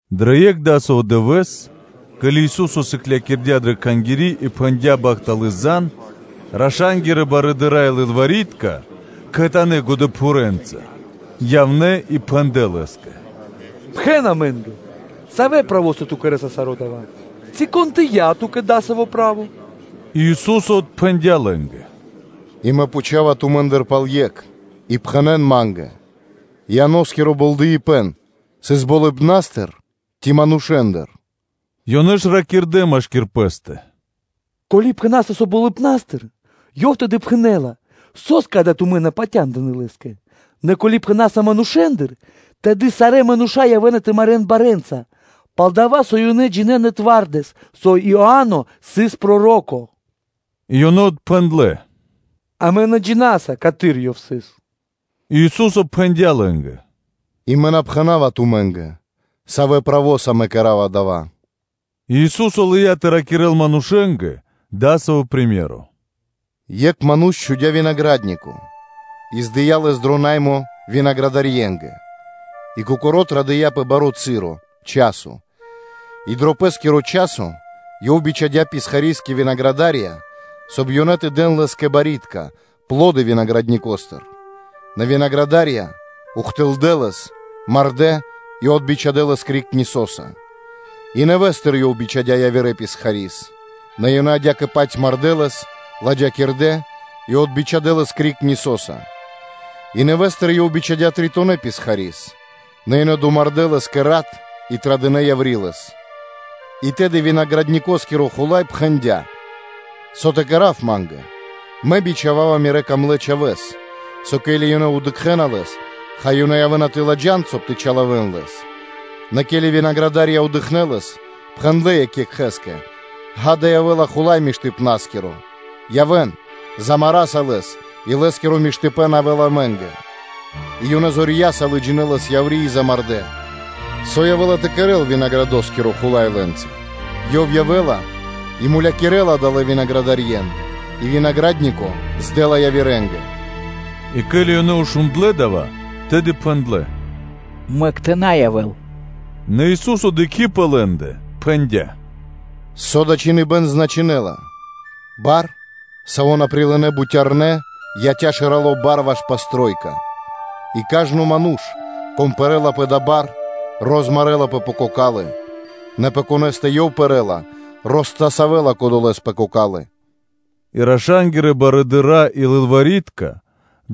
Дро екх дасаво дывэ́с, ке́ли Ису́со сыклякирдя́ дрэ Кхангири́ и пхэндя́ бахтало́ лав, раша́нгирэ барыдыра́ и лылвари́тка кхэтанэ́ годэпхурэнца явнэ́ и пхэндлэ́ Лэ́скэ: “Пхэн амэ́нгэ, савэ́ правоса Ту кэрэ́са саро́ дава́? Ци кон дыя́ Ту́кэ дасаво право?” И Ису́со отпхэндя́ лэ́нгэ: “И Мэ пхучава тумэ́ндыр пал екх, и пхэнэ́н ма́нгэ: ‘Ианоскиро болдэипэн сыс болыбна́стыр ци манушэ́ндыр?’ Ёнэ ж ракирдэ́ машки́р пэ́стэ: ‘Ко́ли пхэна́са, со болыбна́стыр’, Ёв тэды пхэнэ́ла: ‘Со́скэ ада тумэ́ на патяндынэ́ лэ́скэ?’ нэ ко́ли пхэна́са: ‘Манушэ́ндыр,’ тэды сарэ́ мануша́ явэ́на тэ марэ́н барэ́нца, пал-дова́ со ёнэ джинэ́на миштэ́с, со Иа́но сыс проро́ко!” И ёнэ отпхэндлэ́: “Амэ на джина́са, каты́р ёв сыс.” И Ису́со пхэндя́ лэ́нгэ: “И Мэ на пхэна́ва тумэ́нгэ, савэ́ правоса Мэ кэра́ва дава́.” И Ису́со лыя́ тэ ракирэ́л манушэ́нгэ дасаво приме́ро (сыкаибэ́н): “Екх ману́ш чхудя́ винагра́днико и дыя́ лэс дро наймо винаградарьенгэ, и кокоро́ традыя́ пэ баро́ часо. И дро пэ́скиро часо ёв бичхадя́ писхари́с кэ винаградарья, соб (кай) ёнэ тэ дэн лэ́скэ барьякирдэ́ (пло́ды) винаградникостыр; нэ винаградарья ухтылдэ́ лэс, мардэ́ и отбичхадэ лэс криг нисоса. И нэвэ́стыр ёв бичхадя́ явирэ писхари́с: нэ ёнэ адя́кэ-паць мардэ́ лэс, ладжакирдэ́ и отбичхадэ лэс криг нисоса. И нэвэ́стыр ёв бичхадя́ тритонэ писхари́с; нэ ёнэ домардэ́ лэс кэ рат, и традынэ яври́ лэс. И тэды винаградникоскиро хула́й пхэндя́: ‘Со тэ кэра́в ма́нгэ? Мэ бичхава́ва Мирэ́ дрогонэ́ чхавэ́с. Со ке́ли ёнэ дыкхэ́на лэс, хай, ёнэ явэ́на тэ ладжан, соб (кай) тэ чилавэн лэс.’ Нэ ке́ли винаградарья дыкхнэ́ лэс, пхэндлэ́ екх екхэ́скэ: ‘Ѓа́да, явэ́ла хула́й миштыпнаскиро – явэ́н, замараса лэс и лэ́скиро миштыпэ́н явэ́ла амэ́нгэ’. И ёнэ зорья́са лыджинэ́ лэс яври́ и замардэ́. Со явэ́ла тэ кэрэ́л винаградоскиро хула́й лэ́нца? Ёв явэ́ла и мулякирэ́ла адалэ́ винаградарьен и винагра́днико дэ́ла дро наймо явирэ́нгэ.” И ке́ли ёнэ шундлэ́ дава́, тэды пхэндлэ́: “Мэк тэ на явэ́л!” Нэ Ису́со дыкхи́ пэ лэ́ндэ, пхэндя́: “Со дава́ чхиныбэ́н значынэ́ла: ‘Бар, саво́ на прилынэ́ бутярнэ́, яця́ шэралэ́ барэса ваш упрэчхуибэн кхэрэ́скиро.’” И кажно ману́ш, кон пэрэ́ла пэ дава́ бар, розмарэлапэ пэ кокалы́, нэ пэ конэ́стэ ёв пэрэ́ла, ростасавэла кодолэ́с пэ кокалы́.” И раша́нгирэ барыдыра́ и лылвари́тка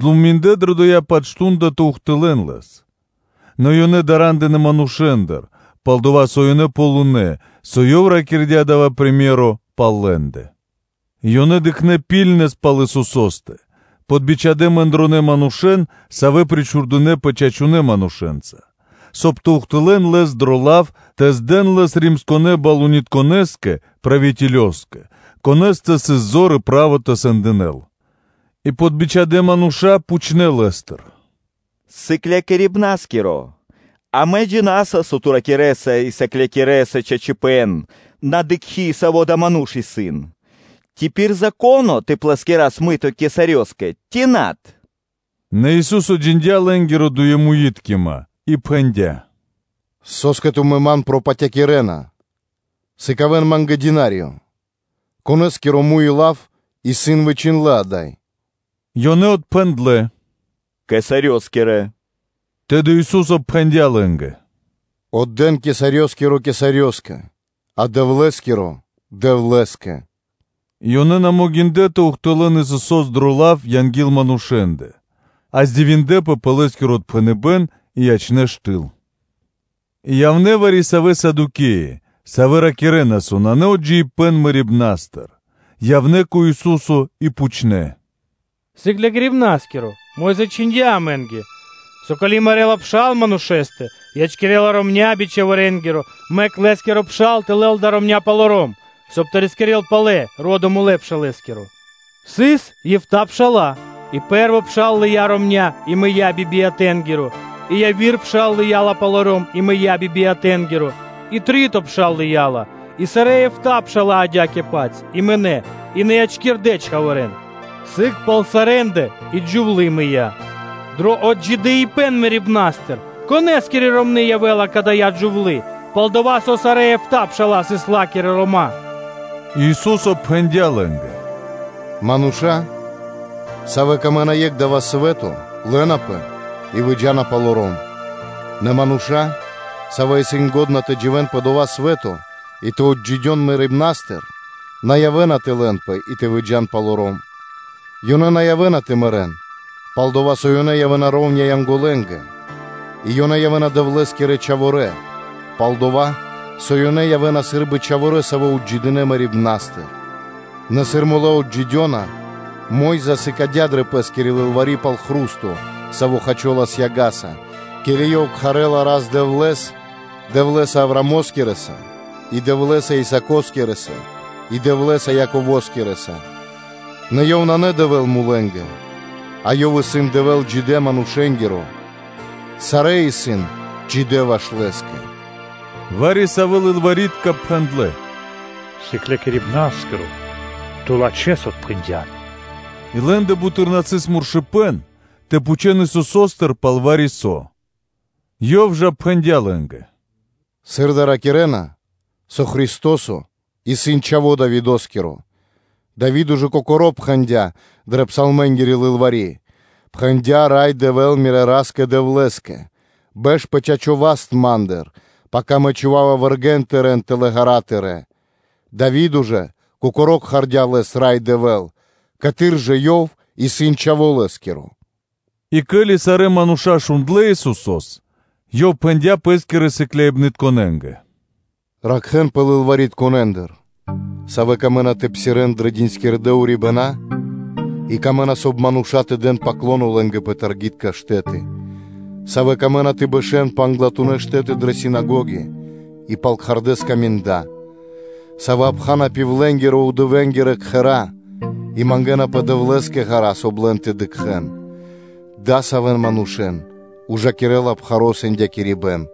дынэ́ годы́ пэ́скэ (думиндлэ) дрэ дова́-паць мардо́ (шту́нда) тэ ухтылэ́н Лэс, нэ ёнэ дара́ндынэ манушэ́ндыр, пал-дова́ со ёнэ ґалынэ́, со Ёв ракирдя́ дава́ приме́ро (сыкаибэ́н) пал лэ́ндэ. И ёнэ дыкхнэ́ ракхибны́ткэс пал Исусо́стэ, подбичхадэ чораханэ манушэ́н, савэ́ причхудэпэ чачунэ́ манушэ́нца, соб (кай) тэ ухтылэ́н Лэс дро лав тэ здэн Лэс Римо́скирэ балунитконэскэ (правителёскэ), конэ́стэ сыс зор и право тэ сэндинэл. И подбичхадэ мануша́ пхучнэ́ Лэ́стыр: “Сыклякирибна́скиро! Амэ джина́са, со Ту ракирэ́са и сыклякирэса чачипэ́н, на дыкхи́, саво́ адава́ ману́ш исын: Ци исын пир Зако́но тэ плэскирас мыто кесарёскэ ци над?” Нэ Ису́со джиндя́ лэ́нгири дуемуиткима и пхэндя́: “Со́скэ тумэ́ Ман пропатякирэна? Сыкавэ́н Ма́нгэ динариё: конэ́скиро муй и лав исын вычхиндлэ́ ада́й?” Ёнэ отпхэндлэ́ “Кесарёскирэ.” Тэды Ису́со пхэндя́ лэ́нгэ: “Отдэ́н кесарёскиро Кесарёскэ, а Дэвлэ́скиро Дэвлэ́скэ.” И ёнэ на могиндлэ́ тэ ухтылэ́н Исусо́с дро лав анги́л манушэ́ндэ, а дивиндлэ́пэ пэ Лэ́скиро отпхэныбэ́н и ячнэ́ штыл. И явнэ́ вари-савэ́ Садукеи, савэ́ ракирэ́нас, со нанэ отджидыипэн мэрибна́стыр, явнэ́ кэ Ису́со и пхучнэ́: “Сыклякирибна́скиро! Мо́йза чхиндя́ амэ́нгэ, со ко́ли мэрэ́ла пшал манушэ́стэ, ячкирэ́ла ромня́ би чхаворэнгиро, мэк лэ́скиро пшал тэ лэл даля ромня́ палоро́м, соб (кай) тэ рискирэ́л палэ ро́до мулэ́ пшалэскиро. Сыс эфта́ (битринэ́нгиро дэш) пша́ла, и пэ́рво пшал лыя́ ромня́ и мыя́ би биятэнгиро; и яви́р пшал лыя́ ла палоро́м и мыя́ би биятэнгиро; и три́то пшал лыя́ ла; и сарэ́ эфта́ пша́ла адя́кэ-паць, и мынэ́, и на ячкирдэ́ чхаворэ́н; сыг пал сарэ́ндэ и джувлы́ мыя́. Дро отджидыипэн мэрибна́стыр, конэ́скири ромны́ явэ́ла кадая́ джувлы́? Пал-дова́ со сарэ́ эфта́ пша́ла сыс ла́кирэ рома́.” Ису́со пхэндя́ лэ́нгэ: “Мануша́, савэ́ латхэ́на дро́гима дро екх дава́ свэ́то, лэнапэ и выджа́на палоро́м; нэ мануша́, савэ́ исын лачхэ́ тэ дживэ́н пэ дова́ свэ́то и тэ отджидён мэрибна́стыр, на явэ́на тэ лэнпэ и тэ выджа́н палоро́м; ёнэ на явэ́на тэ мэрэ́н, пал-дова́ со ёнэ явэ́на шэра́ (ра́внэс) Янголэнгэ; и ёнэ явэ́на Дэвлэ́скирэ чхаворэ́, пал-дова́ со ёнэ явэ́на сы́рбы чхаворэ́, савэ́ отджидинэ мэрибна́стыр. Нэ сыр мулэ́ отджидёна, Мо́йза сыкадя́ дрэ пэ́скири лылвари́ пал хру́сто, саво́ хачолас яга́са, ке́ли ёв кхарэ́ла Рас-Дэвлэ́с Дэвлэ́са Авраамоскирэса и Дэвлэ́са Исаакоскирэса и Дэвлэ́са Яковоскирэса; нэ Ёв исын на Дэвэ́л мулэнгэ, а Ёв исын Дэвэ́л джидэ́ манушэ́нгиро; сарэ́ исын джидэ́ ваш Лэ́скэ.” Вари-савэ́ лылвари́тка пхэндлэ́: “Сыклякирибна́скиро! Ту лачхэ́с отпхэндян!” И лэ́ндэ буты́р на сыс муршыпэн тэ пхучэл Исусо́стыр, пал вари-со Ёв жа пхэндя́ лэ́нгэ: “Сыр дава́ ракирэ́на, со Христо́со исын Чхаво́ Давидо́скиро, Дави́до ж кокоро́ пхэндя́ дрэ Псалмэнгири Лылвари́: ‘Пхэндя Рай Дэвэ́л, Мирэ́ Ра́скэ-Дэвлэ́скэ: ‘Бэш пэ чачо́ васт Ма́ндыр, пака Мэ чхува́ва вэргэ́н Тырэ́н тэл ґэра́ тырэ́’. Дави́до ж Кокоро́ кхардя́ Лэс ‘Рай Дэвэ́л”, каты́р жа Ёв исын чхаво́ Лэ́скиро?’” И ке́ли сарэ́ мануша́ шундлэ́ Исусо́с, Ёв пхэндя́ Пэ́скирэ сыкляибнытконэ́нгэ: “Ракхэ́нпэ лылваритконэндыр, савэ́ камэ́на тэ псирэ́н дрэ диндькирдэ урибэна́ и камэ́на, соб (кай) мануша́ тэ дэн ‘паклоно’ лэ́нгэ пэ таргитка штэ́ты; савэ́ камэ́на тэ бэшэ́н пэ англатунэ́ штэ́ты дрэ синагоги и пал кхардэ́ скаминда; савэ́ обхана пивленгирэ кхэра́ и мангэ́напэ Дэвлэ́скэ ґара́ (длу́гэс), соб (кай) лэн тэ дыкхэ́н. Адасавэн манушэ́н ужакирэ́ла пхаро́ сэндякирибэн.”